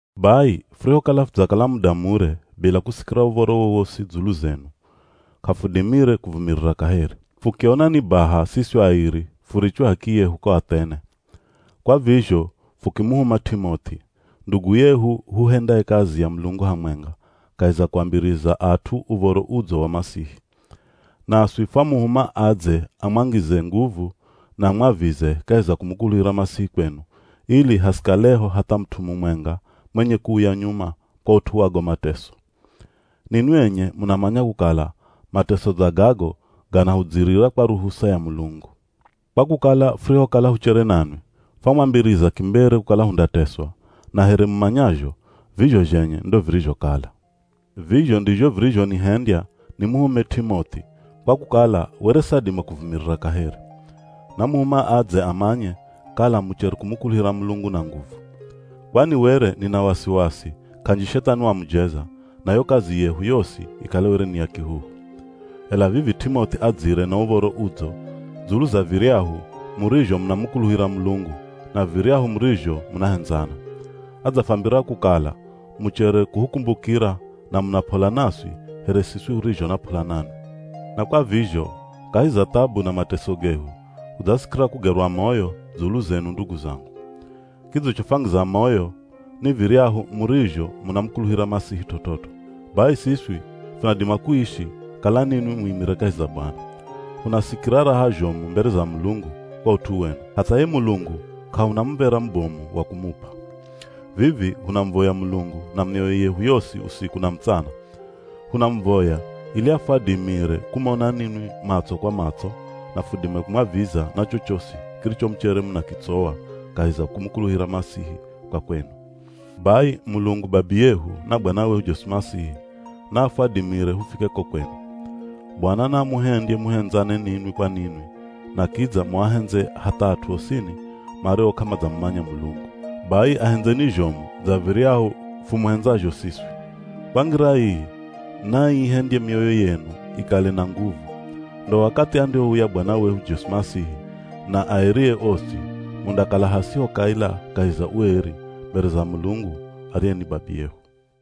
Bai, furihokala fudzakala muda mure bila kusikira uv̱oro wowosi dzulu zenu, k'afudimire kuvumirira kaheri. Fukiona ni baha siswi airi furichwe h'akiyehu ko Athene. Kwa vizho fukimuhuma T'imoth'i, ndugu yehu huhendaye kazi ya Mulungu hamwenga kahi za kuambiriza at'u Uv̱oro Udzo wa Masihi. Naswi fwamuhuma adze amwangize nguvu na amwavize kahi za kumukuluhira Masihi kwenu ili hasikaleho hatha mut'u mumwenga mwenye kuuya nyuma kwa ut'u wa go mateso. Ninwi enye munamanya kukala mateso dza gago ganahudzirira kwa ruhusa ya Mulungu. Kwa kukala furihokala huchere nanwi, fwamwambiriza kimbere kukala hundateswa, na here mumanyazho, vizho zhenye ndo virizhokala. Vizho ndizho virizhonihendya nimuhume T'imoth'i, kwa kukala were sadima kuvumirira kaheri. Namuhuma adze amanye kala muchere kumukuluhira Mulungu na nguvu. Kwani were nina wasiwasi k'anji Shethani wamujeza, na yo kazi yehu yosi ikale were ni ya kihuhu. Ela vivi T'imoth'i adzire na uv̱oro udzo dzulu za viryahu murizho munamukuluhira Mulungu, na viryahu murizho munahendzana. Adzafwambira kukala muchere kuhukumbukira na muna p'ola naswi here siswi hurizho na p'ola nanwi. Na Kwa vizho kahi za thabu na mateso gehu hudzasikira kugerwa moyo dzulu zenu ndugu zangu. Kidzichofwangiza moyo ni viryahu murizho munamukuluhira Masihi t'ot'ot'o. Bai siswi funadima kuishi, kala ninwi muimire kahi za Bwana. Hunasikira raha zhomu mbere za Mulungu kwa ut'u wenu, hatha ye Mulungu k'ahuna muv̱era mubomu wa kumup'a. Vivi hunamuvoya Mulungu na mioyo yehu yosi usiku na mutsana. Hunamuvoya ili afwadimire kumona ninwi matso kwa matso na fudime kumwaviza na chochosi kiricho muchere munakitsowa kahi za kumukuluhira Masihi kwa kwenu. Bai Mulungu Babiyehu na Bwana wehu Jesu Masihi naafwadimire hufike ko kwenu. Bwana naamuhendye muhendzane ninwi kwa ninwi na kidza muahendze hatha at'u osini mario k'amadzamumanya Mulungu. Bai ahendzeni zhomu dza viryahu fumuhendzazho siswi. Kwa ngira ii, naaihendye mioyo yenu ikale na nguvu. Ndo wakathi andihouya Bwana wehu Jesu Masihi na aerie osi mundakala hasiho kaila kahi za ueri mbere za Mulungu ariye ni babiyehu.